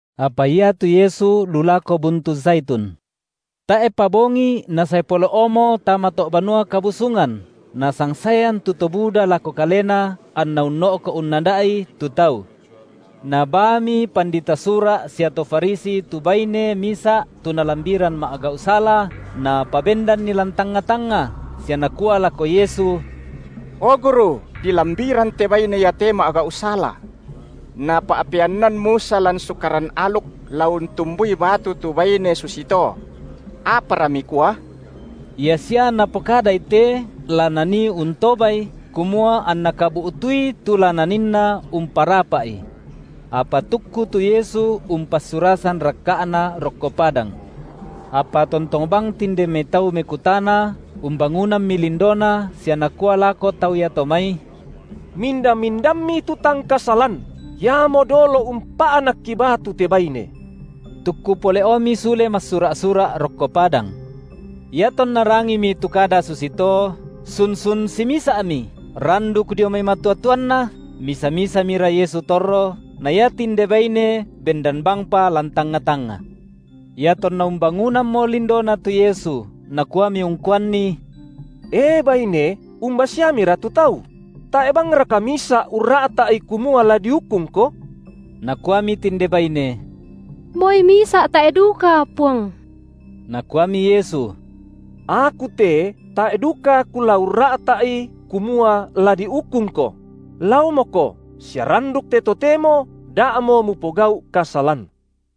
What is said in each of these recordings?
Apa iatu Yesu lu lako buntu Zaitun. Tae’pa bongi Nasae pole’omo tama to’ Banua Kabusungan, nasangsaean tu to buda lako Kalena anNa unno’ko’ unnada’i, tu tau. Nabaami pandita Sura’ sia to Farisi tu baine misa’ tu nalambiran ma’gau’ sala, napabendanni lan tangnga-tangnga, sia nakua lako Yesu: O Guru, dilambiran te baine iate ma’gau’ sala. Napa’peannan Musa lan Sukaran aluk la untumbui batu tu baine susito. Apara Mikua? Ia sia napokadai te, la nanii untobaI, kumua anna kabu’tui tu la naninna umparapa’I. Apa tukku tu Yesu umpassurasan rakka’Na rokko padang. Apa tontong bang tinde mai tau mekutana, umbangunammi lindoNa sia Nakua lako tau iato mai: Minda-mindammi tu tang kasalan, iamo dolo umpa’nakki batu te baine. Tukku pole’omi sule massura’-sura’ rokko padang. Iatonna rangimi tu kada susito, sun-sun simisa’mi, randuk dio mai matua-tuanna; misa-misamira Yesu torro, na ia tinde baine bendan bangpa lan tangnga-tangnga. Iatonna umbangunammo lindoNa tu Yesu, Nakuami ungkuanni: E baine, umba siamira tu tau? Tae’ bangraka misa’ urra’ta’i kumua la diukungko? Nakuami tinde baine: Moi misa’ tae’ duka, Puang. Nakuami Yesu: Aku te tae’ duka Kula urra’ta’i kumua la diukungko; laomoko, sia randuk te totemo da’mo mupogau’ kasalan.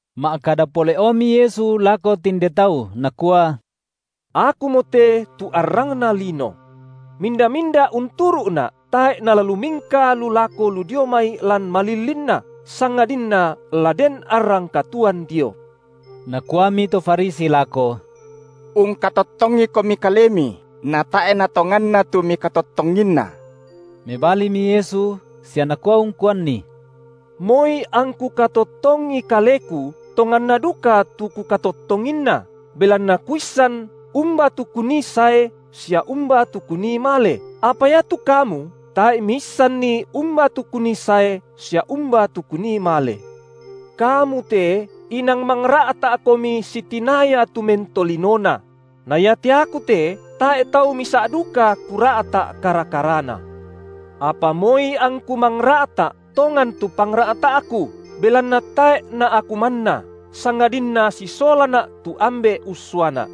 Ma’kada pole’omi Yesu lako tinde tau nakua: Akumote tu arrangna lino. Minda-minda unturu’Na’, tae’ nala lumingka lu lako lu dio mai lan malillinna, sangadinna la den arrang katuoan dio. Nakuami to Farisi lako: UngkatottongiKomi Kalemi, na tae’ natonganna tu Mikatottonginna. Mebalimi Yesu sia nakua ungkuanni: Moi angKu katottongi Kaleku, tonganna duka tu Kukatottonginna, belanna Kuissan, umba tu Kunii sae sia umba tu Kunii male, apa iatu kamu tae’ miissanni umba tu Kunii sae sia umba tu Kunii male. Kamu te inang mangra’ta’komi sitinaya tu mentolinona; na iate Aku te tae’ tau misa’ duka Kura’ta’ kara-karana. Apa moi angKu mangra’ta’, tongan tu pangra’ta’Ku, belanna tae’ na Aku manna, sangadinna sisolaNa’ tu Ambe’ ussuaNa’.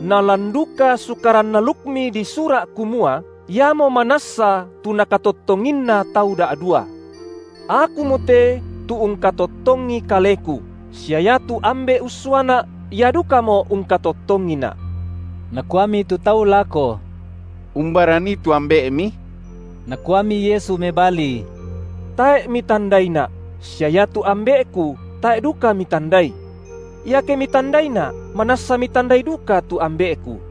Na lan duka Sukaran alukmi disura’ kumua, iamo manassa tu nakatottonginna tau da’dua. Akumote tu ungkatottongi Kaleku, sia iatu Ambe’ ussuaNa’, Ia dukamo ungkatottongiNa’. Nakuami tu tau lako: Umbara nii tu Ambe’Mi? Nakuami Yesu mebali: Tae’ mitandaiNa’, sia iatu Ambe’Ku tae’ duka mitandai. Iake mitandaiNa’, manassa mitandai duka tu Ambe’Ku.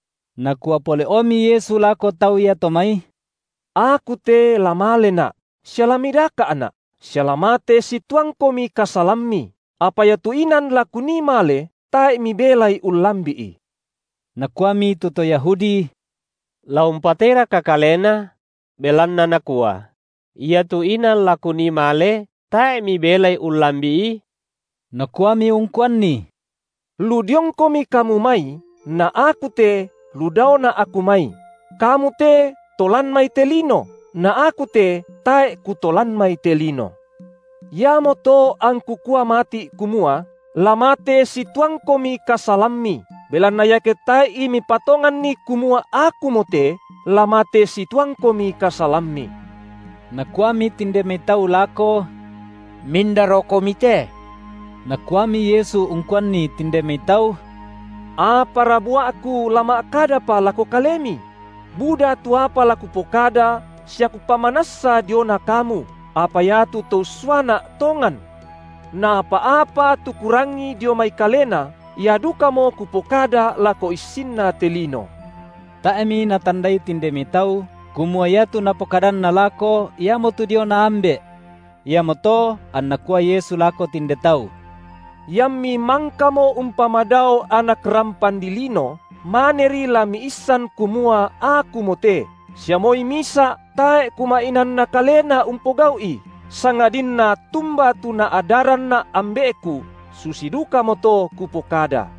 Nakua pole’omi Yesu lako tau iato mai: Aku te la maleNa’, sia la midaka’Na’, sia la mate situangkomi kasalammi, apa iatu inan la Kunii male, tae’ mibelai ullambi’i. Nakuami tu to Yahudi: La umpateiraka kaleNa? belanna Nakua: Iatu inan la Kunii male, tae’ mibelai ullambi’i? Nakuami ungkuanni: Lu diongkomi kamu mai, na Aku te lu daoNa’ Aku mai; kamu te to lan mai te lino na Aku te tae’ Kuto lan mai te lino. Iamoto angKu kua mati’ kumua, la mate situangkomi kasalammi, belanna iake tae’i mipatonganni kumua Akumote, la mate situangkomi kasalammi. Nakuami tinde mai tau lako: Mindarokomi te? Nakuami Yesu ungkuanni tinde mai tau: Apara bua’Ku la ma’kadapa lako kalemi? Buda tu apa la Kupokada sia Kupamanassa diona kamu, apa iatu To ussuaNa’ tongan. Na apa-apa tu Kurangi dio mai Kalena ia dukamo Kupokada lako issinna te lino. Tae’mi natandai tinde mai tau, kumua iatu Napokadanna lako iamotu diona Ambe’. Iamoto anNa kua Yesu lako tinde tau: Iammi mangkamo umpamadao Anak rampan dilino, maneri la miissan kumua Akumote, sia moi misa’ tae’ Kuma’inaanna kalena umpogau’i, sangadinna tumba tu NaadaranNa’ Ambe’Ku, susi dukamoto Kupokada.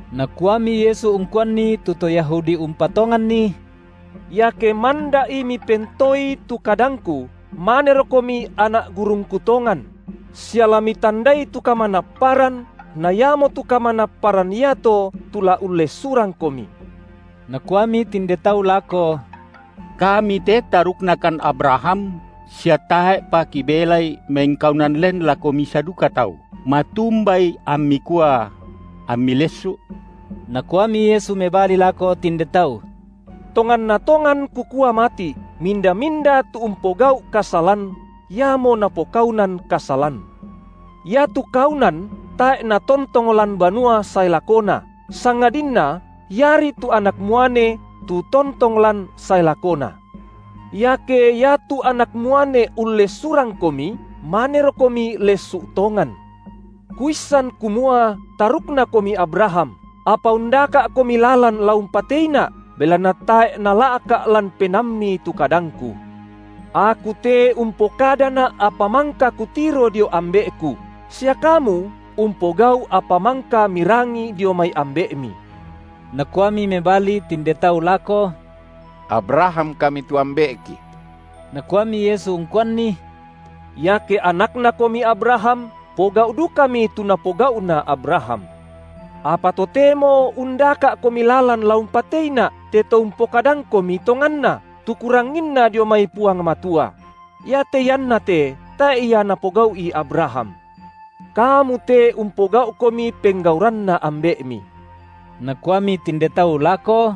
Nakuami Yesu ungkuanni tu to Yahudi umpatonganNi: Iake manda’i mipentoei tu kadangKu, manerokomi anak gurungKu tongan; sia la mitandai tu kamanapparan na iamotu kamanapparan iato tu la ullessurangkomi. Nakuami tinde tau lako: Kami te taruknakan Abraham, sia tae’pa kibelai mengkaunan len lako misa duka tau; matumbai amMi kua: Ammi lessu’? Nakuami Yesu mebali lako tinde tau: Tonganna tongan Kukua mati’, minda-minda tu umpogau’ kasalan, iamo napokaunan kasalan. Iatu kaunan tae’ natontong lan banua sae lakona, sangadinna iari tu anak muane tu tontong lan sae lakona. Iake iatu Anak muane ullessurangkomi, manerokomi lessu’ tongan. Kuissan kumua taruknakomi Abraham, apa undaka’komi lalan la umpateiNa’, belanna tae’ nala’ka’ lan penaammi tu kadangKu. Aku te umpokadaNa’ apa mangka Kutiro dio Ambe’Ku; sia kamu umpogau’ apa mangka mirangi dio mai ambe’mi. Nakuami mebali tinde tau lako: Abraham kami tu ambe’ki. Nakuami Yesu ungkuanni: Iake anaknakomi Abraham, pogau’ dukami tu napogau’na Abraham. Apa totemo undaka’komi lalan la umpateiNa’, te To umpokadangkomi tonganna, tu Kuranginna dio mai Puang Matua; iate iannate tae’ ia napogau’i Abraham. Kamu te umpogau’komi penggauranna ambe’mi. Nakuami tinde tau lako: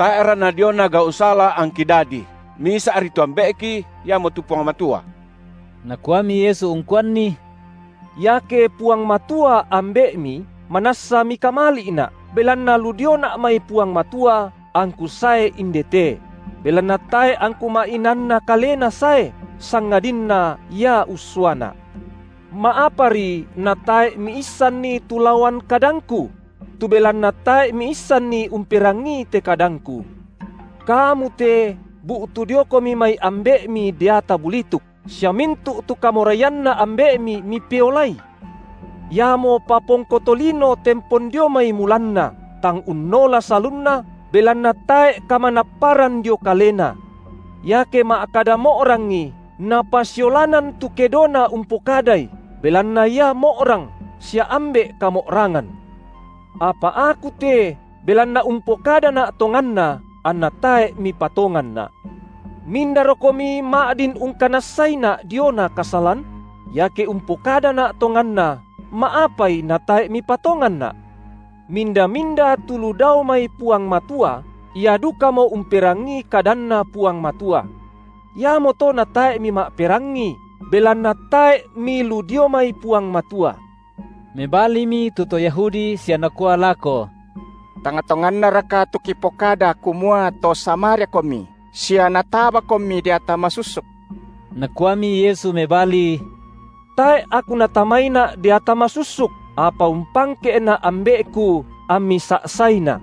Tae’ra nadiona gau’ sala angki dadi. Misa’ri tu Ambe’ki, iamotu Puang Matua. Nakuami Yesu ungkuanni: Iake Puang Matua Ambe’mi, manassa mikamali’Na’, belanna lu dioNa’ mai Puang Matua angKu sae indete; belanna tae’ angKu ma’inaanna kalena sae, sangadinna Ia ussuaNa’. Ma’apari natae’ miissanni tu laoan kadangKu? Tu belanna tae’ miissanni umperangii te kadangKu. Kamu te bu’tu diokomi mai ambe’mi deata bulituk, sia mintu’ tu kamoraianna ambe’mi mipeolai. Iamo papongko tolino tempon dio mai mulanna, tang unnola salunna, belanna tae’ kamanapparan dio kalena. Iake ma’kada mo’rangi, napasiolanan tu kedona umpokadai, belanna ia mo’rang, sia ambe’ kamo’rangan. Apa Aku te, belanna umpokadaNa’ tonganna, anna tae’ mipatonganNa’. Mindarokomi ma’din ungkanassaiNa’ diona kasalan? Iake umpokadaNa’ tonganna, ma’apai natae’ mipatonganNa’? Minda-minda tu lu dao mai Puang Matua, ia dukamo umperangii kadanNa Puang Matua. Iamoto na tae’ mima’perangi, belanna tae’ milu dio mai Puang Matua. Mebalimi tu to Yahudi sia nakua lako: Tang tongannaraka tu kipokada kumua to SamariaKomi sia natabaKomi deata masussuk? Nakuami Yesu mebali: Tae’ Aku natamaiNa’ deata masussuk, apa umpangke’Na’ Ambe’Ku, ammi sa’saiNa’.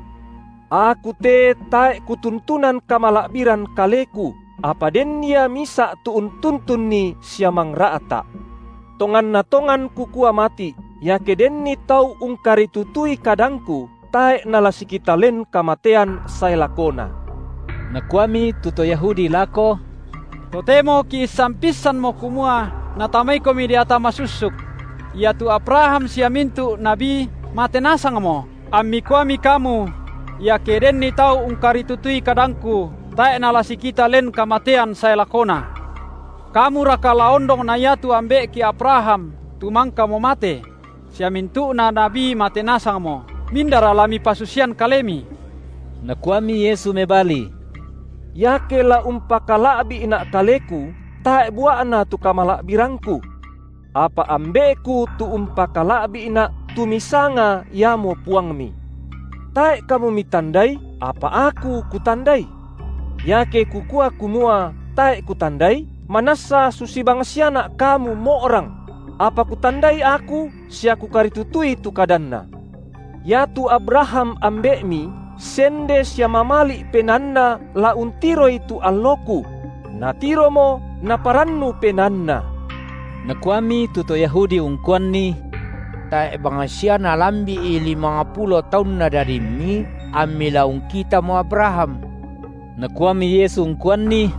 Aku te tae’ Kutuntunan kamala’biran Kaleku, apa den Ia Misa’ tu untuntunni sia mangra’ta’. Tonganna tongan Kukua mati’, iake denni tau ungkaritutui kadangKu, tae’ nala sikita len kamatean sae lakona. Nakuami tu to Yahudi lako: Totemo kiissan pissanmo kumua natamaiKomi deata masussuk. Iatu Abraham sia mintu’ nabi mate nasangmo, ammi kuami kamu: iake denni tau ungkaritutui kadangku, tae’ nala sikita len kamatean sae lakona. Kamuraka la ondong na iatu ambe’ki Abraham, tu mangkamo mate? sia mintu’na nabi mate nasangmo. Mindara la Mipasusian Kalemi? Nakuami Yesu mebali: Iake la umpakala’bi’Na’ Kaleku, tae’ bua’na tu kamala’birangKu. Apa Ambe’Ku tu umpakala’bi’Na’, tu misanga iamo Puangmi. Tae’ kamu mitandai, apa Aku Kutandai. Iake Kukua kumua, tae’ Kutandai, manassa susi bangsiaNa’ kamu mo’rang; apa Kutandai Aku sia Kukaritutui tu kadanNa. Iatu Abraham ambe’mi sende sia mamali’ penaanna la untiroi tu alloKu; natiromo naparannu penaanna. Nakuami tu to Yahudi ungkuanNi: Tae’ bangsia nalambi’i limangpulo taunna dadimMi, amMi la ungkitaomo Abraham? Nakuami Yesu uangkuanni: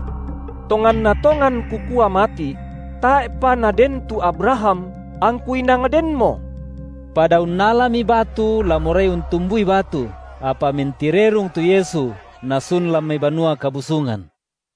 Tonganna tongan Kukua mati’: Tae’pa naden tu Abraham, angKu inang Denmo. Pada unnalami batu la morai untumbui batu, apa mentirerung tu Yesu Nasun lan mai Banua Kabusungan.